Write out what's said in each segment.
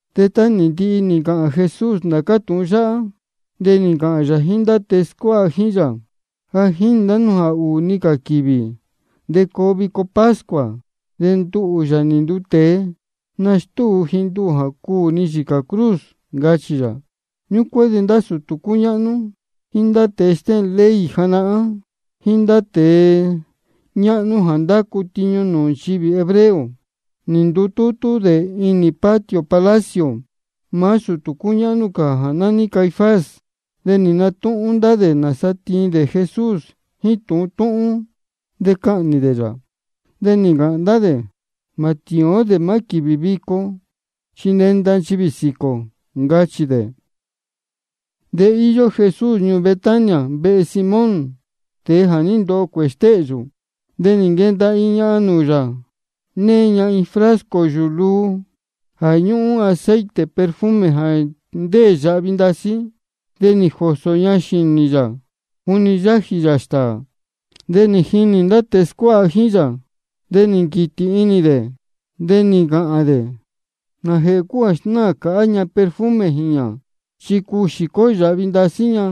De tá nī ndihi nī ncāhān Jesús ndācá tūhun yáhá, de nī ncāhān yā jíín ndá tēe scuáha jíín yā: Ja jínī ndá nú jā ūū-ni cā quīvī de coo vico pascua. De nduhū, Yāā nī nduu tēe, nastúu ji nduhū jā cuū ni yīcā cruz, ncachī yā. Ñúcuán de ndá sūtū cúñáhnú, jíín ndá tēe stéhēn ley janahán, jíín ndá tēe ñáhnú jā ndácu nūū nchivī hebreo, nī ndutútú dē inī patio palacio maá sūtū cúñáhnú cā jā nání Caifás. De nī natúhún ndá dē nāsa tiin dē Jesús jíín tūhun túhún, de cahnī dē yā. De nī ncāhān ndá dē: Mā tīín ó dē maá quīvī vico, chi nenda nchivī sīquī ō, ncachī dē. De íyó Jesús ñuū Betania, vehe Simón, tēe jā ní ndoho cuēhē stéhyū. De nī nquenda iin ñahan nūū yā, née ña iin frasco yūū luu jā ñúhún aceite perfume jā ndéē yāhvi ndasí. De nī jōsō ña xīnī yā juni yájī yā stāā. De nī jinī ndá tēe scuáha jíín yā, de nī nquītī inī dē, de nī ncāhān dē: ¿Nājēhē cúu jā snáā cāhá ña perfume jīñā? Chi cuu xīcó yāhvi ndasí ña,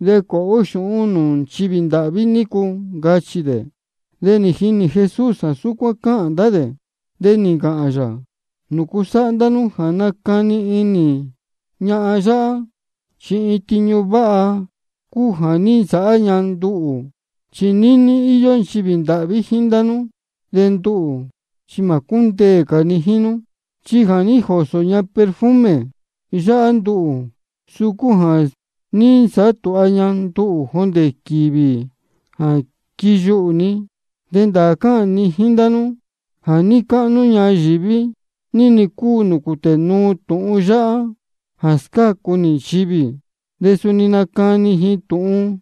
de cuāha ó xūhún nūū nchivī ndāhví nícu, ncachī dē. De nī jinī Jesús jā súcuán cáhān ndá dē. De nī ncāhān yā: ¿Nūcu sáhá ndá nú jā nácani inī ñahan yáhá? Chi iin tiñu váha cúu jā ní nsāhá ña nduhū. Chi níní íyó nchivī ndāhví jíín ndá nú, de nduhū chi mā cúndeē cā ni jíín nú. Chi jā ní jōsō ña perfume yáhá nduhū, de suu cúu jā ní nsāhá tūha ña nduhū jondē quīvī jā quiyuhū ni. De ndāā cáhān ni jíín ndá nú jā níí cáhnú ñayīví ní-ni cúu nūū cūtē nuu tūhun yáhá jā scácu nī nchivī, de suni nacani ji tūhun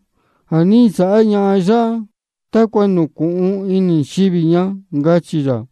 jā ní nsāhá ñahan yáhá, tácua nūcūhun inī nchivī ña, ncachī yā.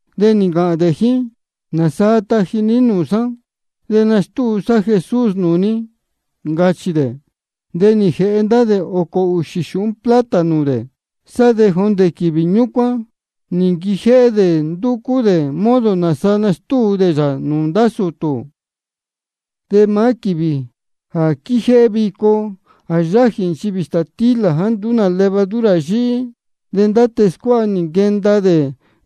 De nī ncāhān dē jíín: ¿Nāsaa taji ní nūū sá, de nastúu sá Jesús nūū ní? ncachī dē. De nī jēhe ndá ōcō ūxī xūhún plata nūū dē. Sá de jondē quīvī ñúcuán nī nquijéhé dē ndúcú dē modo nāsa nastúu dē yā nūū ndá sūtū. De maá quīvī jā quíjéhé vico jā yájī nchivī stātílā jāá nduú nā levadura yíhí, de ndá tēe scuáha nī nquenda dē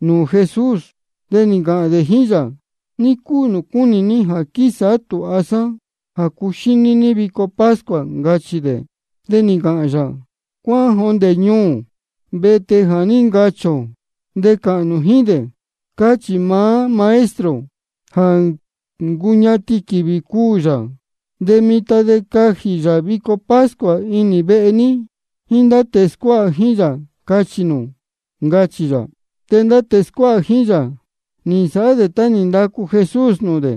nūū Jesús. De nī ncāhān dē jíín yā: ¿Ní cúu nūū cúnī ní jā quísāhá tūha sá nūū cuxíní ní vico pascua? ncachī dē. De nī ncāhān yā: Cuáhán jondē ñuū, vehe tēe jā ní ncachī ō, de cāhān nū jíín dē: Cáchī maá Maestro, ja ncuñatin quīvī cuū yā. De mitan de cajī yā vico pascua inī vehe ní jíín ndá tēe scuáha jíín yā, cachī nū, ncachī yā. De ndá tēe scuáha jíín yā, nī nsāhá dē tá nī ndacu Jesús nūū dē,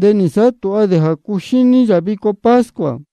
de nī nsāhá tūha dē jā cuxíní yā vico pascua.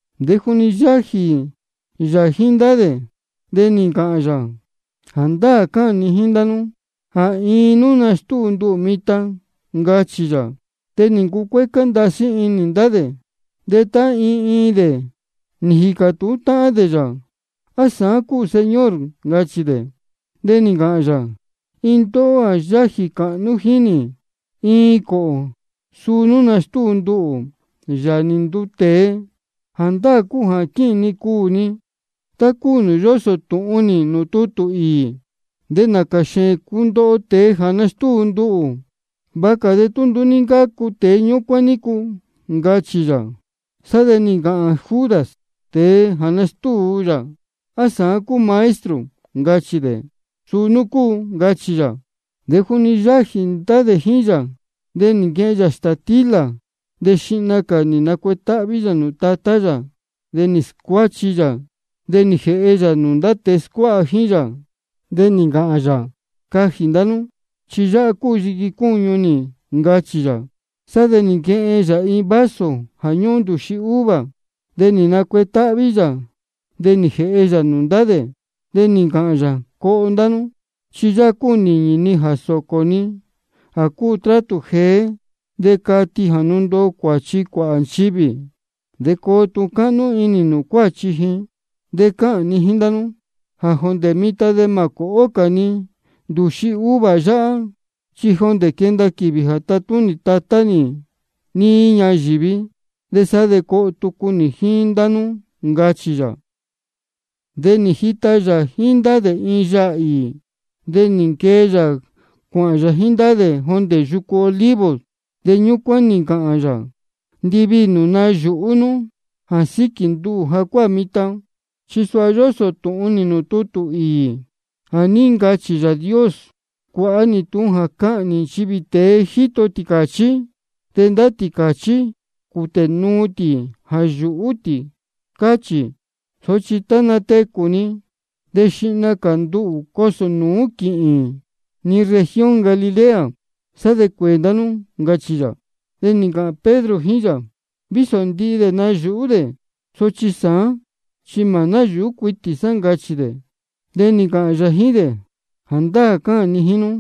De juni yájī yā jíín ndá dē de nī ncāhān yā: Jāndáā cáhān ni jíín ndá nú jā iin nú nastúu nduhū mitan, ncachī yā. De nī ncucuécá ndasí inī ndá dē. De tá iin iin dē nī jīcā tūhún dē yā: ¿A sāán cúu, Señor? ncachī dē. De nī ncāhān yā: Iin ndóhó jā yájī cāhnú jíín nī iin cōhō, suu nú nastúu nduhū. De nduhū, Yāā nī nduu tēe, jāndáā cúu jā quīhīn ni cuū ni, tá cúu nūū yósō tūhun nī nūū tutū īī. De nācā xēēn cundoho tēe jā nastúu nduhū. Vāha cā de tú nduú ní ncácu tēe ñúcuán nícu, ncachī yā. Sá de nī ncāhān Judas, tēe jā nastúu yā: ¿A sāán cúu, Maestro? ncachī dē. Suu nú cúu, ncachī yā. De juni yájī ndá dē jíín yā, de nī nquehen yā stātílā, de xihna cā nī nacuetáhví yā nūū Tatá yā, de nī scuáchi yā, de nī jēhe yā nūū ndá tēe scuáha jíín yā. De nī ncāhān yā: Cajī ndá nú, chi yáhá cúu yiqui cúñu nī, ncachī yā. Sá de nī nquehen yā iin vaso jā ñúhún ndūxi uva, de nī nacuetáhví yā, de nī jēhe yā nūū ndá dē. De nī ncāhān yā: Coho ndá nú. Chi yáhá cúu nīñī ni jā sōcō ni jā cúu trátū jeé, de cati jā ndundoo cuāchi cuāhā nchivī, de coo tūhun cáhnú inī nūū cuāchi ji. De cáhān ni jíín ndá nú jā jondē mitan de mā cōhó cā ni ndūxi uva yáhá, chi jondē quenda quīvī jā tatúnī Tatá nī níí ñayīví, de sá de coho tucu nī jíín ndá nú, ncachī yā. De nī jita yā jíín ndá dē iin yaā īī. De nī nquee yā cuāhān yā jíín dē jondē yucu Olivos. Ñúcuán de nī ncāhān yā: Ndiviī nū nayūhú nú jā síquī nduhū jacuáā mitan. Chi suha yósō tūhun nī nūū tutū īī jā ní ncachī Yāā Dios: Cuāha nī tūhun jā cahnī nchivī tēe jíto tīcāchí, de ndá tīcāchí cūtē nuu tī jā yūhú tī, cáchī. Sochi tá natecū ni, de xihna cā nduhū cosō nūú quīhīn ni región Galilea, de sá de cuēē ndá nú, ncachī yā. De nī ncāhān Pedro jíín yā: Vísō ndihi dē nayūhú dē, sochi sāán chi mā náyūhú cuitī sá, ncachī dē. De nī ncāhān yā jíín dē: Jāndáā cáhān ni jíín nú,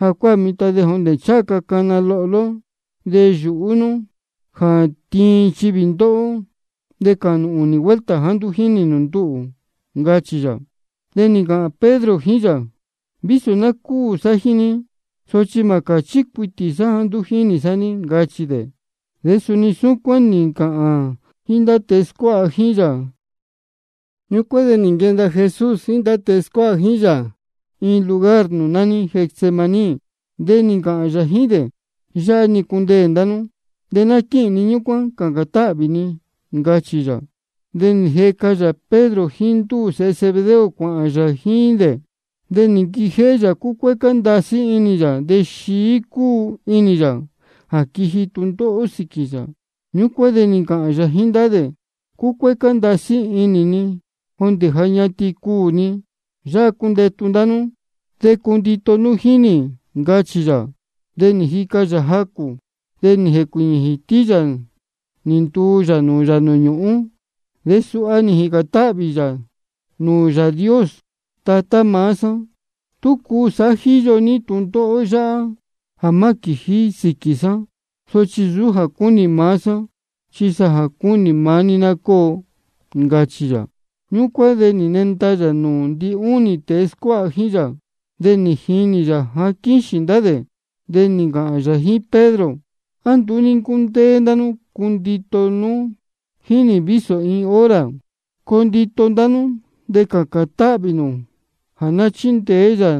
jacuáā mitan jondē ncháha ca cana lohló, de yūhú nú jā tiin nchivī ndóhó, de cachī nū ūnī vuelta jāá nduú jínī nū nduhū, ncachī yā. De nī ncāhān Pedro jíín yā: Vísō ná cúū sá jíín ní, sochi mā cāchí cuitī sá jāá nduú jínī sá ní, ncachī dē. De suni súcuán nī ncāhān ndihi ndá tēe scuáha jíín yā. Ñúcuán de nī nquenda Jesús jíín ndá tēe scuáha jíín yā iin lugar nūū nání Getsemaní. De nī ncāhān yā jíín dē: Yáhá-ni cundeē ndá nú, de ná quíhīn ni ñúcuán cācān táhvī ni, ncachī yā. De nī jeca yā Pedro jíín ndúū sēhe Zebedeo cuāhān yā jíín dē. De nī nquijéhé yā cúcuécá ndasí inī yā de xií cúu inī yā jā quiji tūndóhó sīquī yā. Ñúcuán de nī ncāhān yā jíín ndá dē: Cúcuécá ndasí inī ni jondē ja ñatin cuū ni. Yáhá cundetu ndá nú de cundito nú jíín nī, ncachī yā. De nī jica yā jacū cā, de nī jēcuīñī jītí yā nī ntuu yā nūū yā nūū ñūhún, de suha nī jīcān táhvī yā nūū Yāā Dios: Tatá maá sá, tú cuu de sāhá jíyo ní tūndóhó yáhá jā má quījí sīquī sá. Sochi nsūú jā cúnī maá sá, chi jā cúnī maá ní ná cóo, ncachī yā. Ñúcuán de nī nenda yā nūū ndinúnī tēe scuáha jíín yā, de nī jinī yā jā quíxīn ndá dē. De nī ncāhān yā jíín Pedro: ¿A nduú ní ncúndéé ndá nú cundito nú jíín nī vísō iin hora? Coo ndito inī ndá nú de cācān táhvī nū jā chindeé yā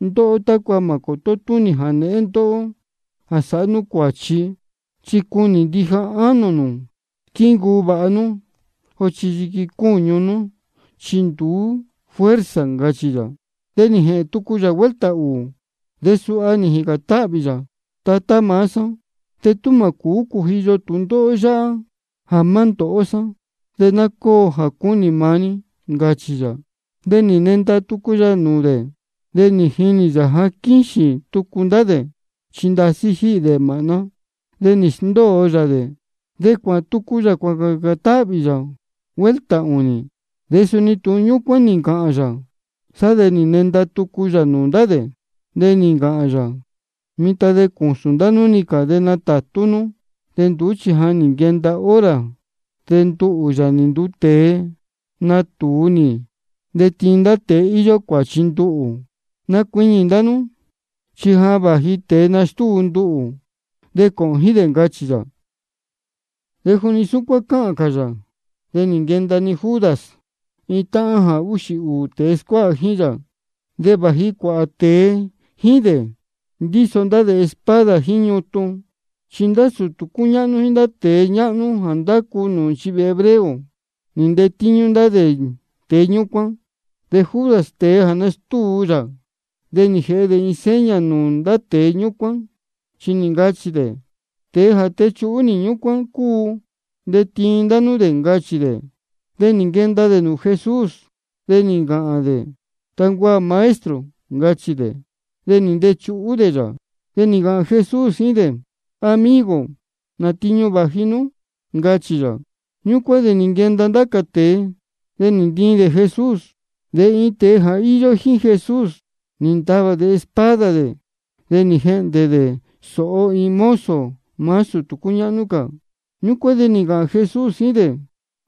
ndóhó tácua mā cōtó túnī jānēhén ndóhó jā sāhá nú cuāchi. Chi cúnī ndija ánō nū squíncuu vāha nú, sochi yiqui cúñu nú chi nduú fuerza, ncachī yā. De nī jēhēn tucu yā vuelta ūū, de suha nī jīcān táhvī yā: Tatá maá sá, de tú mā cūú cujiyo tūndóhó yáhá jā má ndōhó sá, de ná cóo jā cúnī maá ní, ncachī yā. De nī nenda tucu yā nūū dē, de nī jinī yā jā quíxīn tucu ndá dē, chi ndasí jíhī dē māhná. De nī sndóo yā dē, de cuāhān tucu yā cuācācān táhvī yā vuelta ūnī, de suni tūhun ñúcuán nī ncāhān yā. Sá de nī nenda tucu yā nūū ndá dē, de nī ncāhān yā: Mitan de cūsūn ndá nú-ni cā de natātú nú. De nduú chi ja nī nquenda hora, de nduhū, Yāā nī nduu tēe, natūu nī de tiin ndá tēe íyó cuāchi nduhū. Nacuiñī ndá nú, chi ja vāji tēe nastúu nduhū, de cōhōn jíín dē, ncachī yā. De juni súcuán cáhān cā yā, de nī nquenda-ni Judas, iin táhán jā úxī ūū tēe scuáha jíín yā. De vāji cuāhā tēe jíín dē, ndíso ndá dē espada jíín ñutun. Chi ndá sūtū cúñáhnú jíín ndá tēe ñáhnú jā ndácu nūū nchivī hebreo, nī ntetíñú ndá tēe ñúcuán. De Judas, tēe jā nastúu yā, ja nī jēhe dē iin seña nūū ndá tēe ñúcuán, chi nī ncachī dē: Tēe jā techuhú nī, ñúcuán cúu. De tiin ndá nú dē, ncachī dē. De nī nquenda dē nūū Jesús, de nī ncāhān dē: Tancuaā, Maestro, ncachī dē. De nī ntechuhú dē yā. De nī ncāhān Jesús jíín dē: Amigo, ¿nā tiñu vāji nú? ncachī yā. Ñúcuán de nī nquenda ndá cā tēe, de nī ntiin dē Jesús. De iin tēe jā íyó jíín Jesús, nī ntavā dē espada dē, de nī jehndē dē sōho iin mozo maá sūtū cúñáhnú cā. Ñúcuán de nī ncāhān Jesús jíín dē: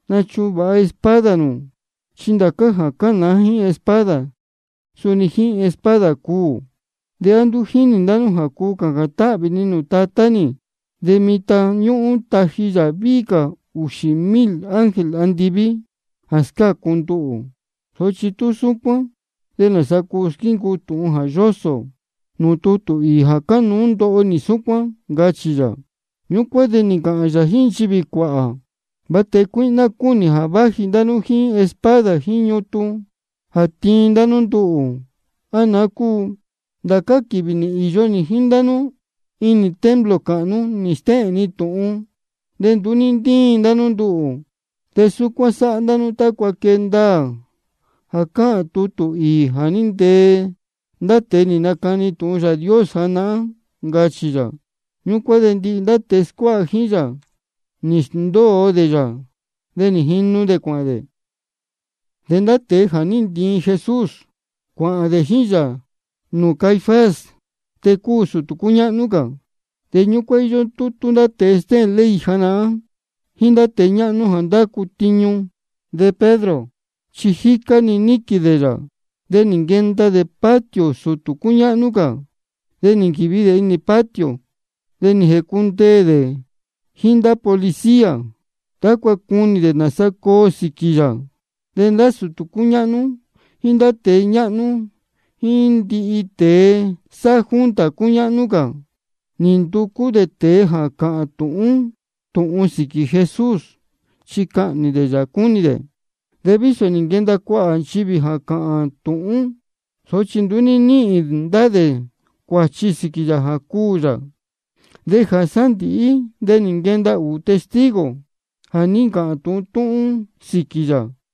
Nachuvāha espada nū, chi ndācá jā cánāá jíín espada, suni jíín espada cuū. ¿De á nduú jínī ndá nú jā cuu cācān táhvī ni nūū Tatá nī, de mitan ñúhún tají yā víhí cā ūxī ūū mil ángel andiví jā scácu nduhū? Sochi tú súcuán, ¿de nāsa cuu squíncuu tūhun jā yósō nūū tutū īī jā cánuú ndoho nī súcuán? ncachī yā. Ñúcuán de nī ncāhān yā jíín nchivī cuāhā: ¿De va tēe cuíhná cúu nī jā váji ndá nú jíín espada jíín ñutun jā tiin ndá nú nduhū, á naá cúu? Ndācá quīvī nī īyo nī jíín ndá nú inī templo cāhnú, nī stéhēn ni tūhun, de nduú ní ntíin ndá nú nduhū. De súcuán sáhá ndá nú tácua quee ndaā jā cáhān tutū īī jā ní ntee ndá tēe nī nacani tūhun Yāā Dios, ncachī yā. Ñúcuán de ndihi tēe scuáha jíín yā, nī sndóo dē yā, de nī jinu dē cuāhān dē. De ndá tēe jā ní ntiin Jesús, cuāhān dē jíín yā nūū Caifás, tēe cúu sūtū cúñáhnú cā. De ñúcuán íyó tútú ndá tēe stéhēn ley janahán, jíín ndá tēe ñáhnú jā ndácu tiñu. De Pedro chi jícá-ni níquīn dē yā, de nī nquenda dē patio sūtū cúñáhnú cā. De nī nquīvi dē inī patio, de nī jēcundeē dē jíín ndá policía, tácua cunī dē nāsa coo sīquī yā. De ndá sūtū cúñáhnú jíín ndá tēe ñáhnú jíín ndihi tēe sáhá junta cúñáhnú cā, nī nducú dē tēe jā cāhān tūhun túhún sīquī Jesús, chi cahnī dē yā cúnī dē. De vísō nī nquenda cuāhā nchivī jā cáhān tūhún, sochi nduú ní níhīn ndá dē cuāchi sīquī yā jā cuū yā. De jā sándīhí de nī nquenda ūū testigo jā ní ncāhān tūhun túhún sīquī yā: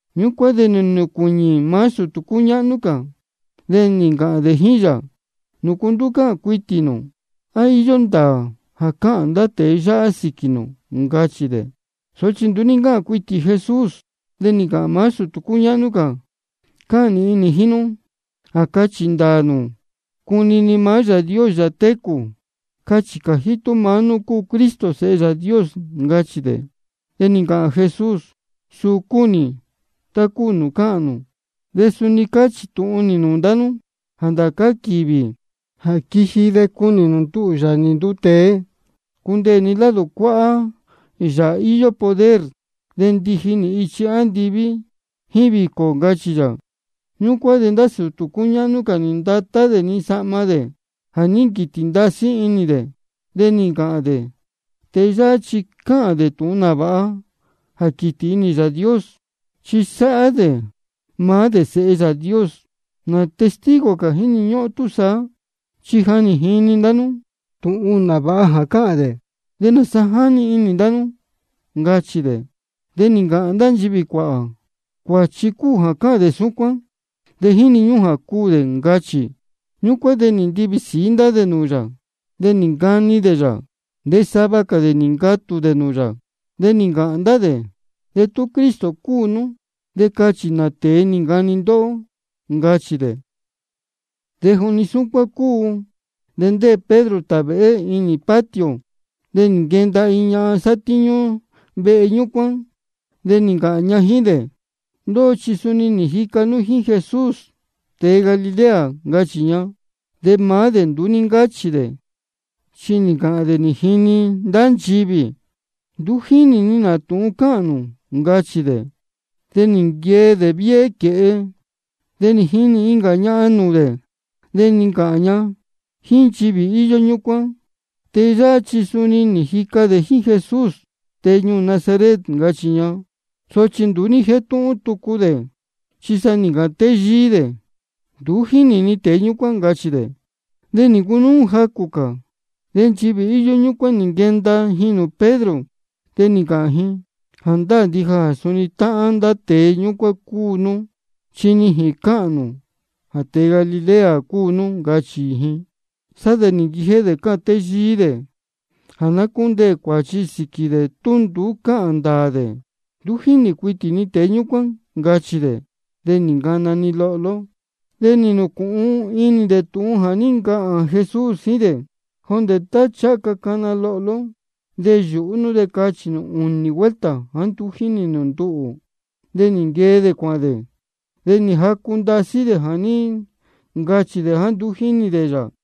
Ñúcuán de nī nacuiñī maá sūtū cúñáhnú cā, de nī ncāhān dē jíín yā: ¿Nūcu nduú cáhān cuitī nū? ¿A íyó ndāā jā cáhān ndá tēe yáhá sīquī nū? ncachī dē. Sochi nduú ní ncáhān cuitī Jesús. De nī ncāhān maá sūtū cúñáhnú cā: Cáhān nīhin nī jíín nú jā cachī ndāā nū cunini maá Yāā Dios, Yāā técū. Cachī cājí tú maá nú cúu Cristo, Sēhe Yāā Dios, ncachī dē. De nī ncāhān Jesús: Suu cúu nī, tá cúu nūū cáhān nū. De suni cáchī tūhun nī nūū ndá nú jā ndācá quīvī jā quiji de cunī nū jā nduhū, Yāā nī nduu tēe, cundeē ni lado cuáhá Yāā íyó poder, de ndiji nī ichi andiví jíín vīcō, ncachī yā. Ñúcuán de sūtū cúñáhnú cā nī ndatá dē-ni sahma dē jā ní nquītī ndasí inī dē, de nī ncāhān dē: Tēe yáhá chi cáhān dē tūhun nāvāha jā quītī inī Yāā Dios, chi sáhá dē maá dē Sēhe Yāā Dios. ¿Nā testigo cā jíni ñúhún ó túsaá? Chi ja nī jini ndá nú tūhun nāvāha jā cáhān dē. ¿De nāsa jáni inī ndá nú? ncachī dē. De nī ncāhān ndá nchivī cuāhā: Cuāchi cúu jā cáhān dē súcuán, de jíni ñúhún jā cuū dē, ncachī. Ñúcuán de nī ntivī sīí ndá dē nūū yā, de nī ncani dē yā. De sava cā dē nī ncatū dē nūū yā. De nī ncāhān ndá dē: De tú Cristo cúu nú, de cachī nā tēe nī ncani ndóhó, ncachī dē. De juni súcuán cúu, de ndéē Pedro tāvēhé inī patio. De nī nquenda iin ñahan sátíñú vehe ñúcuán, de nī ncāhān ña jíín dē: Ndóhó chi suni nī jica nú jíín Jesús tēe Galilea, ncachī ña. De maá dē nduú ní ncáchī dē, chi nī ncāhān dē nī jini ndá nchivī: Nduú jínī ni nā tūhun cáhān nū, ncachī dē. De nī nquee dē viéhé quēhe, de nī jinī incā ñahan nūū dē. De nī ncāhān ña jíín nchivī íyó ñúcuán: Tēe yáhá chi suni nī jica dē jíín Jesús, tēe ñuū Nazaret, ncachī ña. Sochi nduú ní jétúhún tucu dē, chi sa nī ncāhān téyíí dē: Nduú jínī ni tēe ñúcuán, ncachī dē. De nī ncunúú jacū cā, de nchivī íyó ñúcuán nī nquenda ji nūū Pedro, de nī ncāhān ji: Jāndáā ndija jā suni táhán ndá tēe ñúcuán cúu nú, chi nijīn cáhān nū jā tēe Galilea cúu nú, ncachī ji. Sá de nī nquijéhé dē cáhān téyíí dē jā ná cúndeē cuāchi sīquī dē de tú nduú cáhān ndāā dē: Nduú jínī cuitī ni tēe ñúcuán, ncachī dē. De nī ncana-ni lohló. De nī nūcūhun inī dē tūhun jā ní ncāhān Jesús jíín dē: Jondē tá ncháha ca cana lohló, de yūhú nú de cachī nū ūnī vuelta jāá nduú jínī nū nduhū. De nī nquee dē cuāhān dē, de nī jacu ndasí dē jā ní ncachī dē jāá nduú jínī dē yā.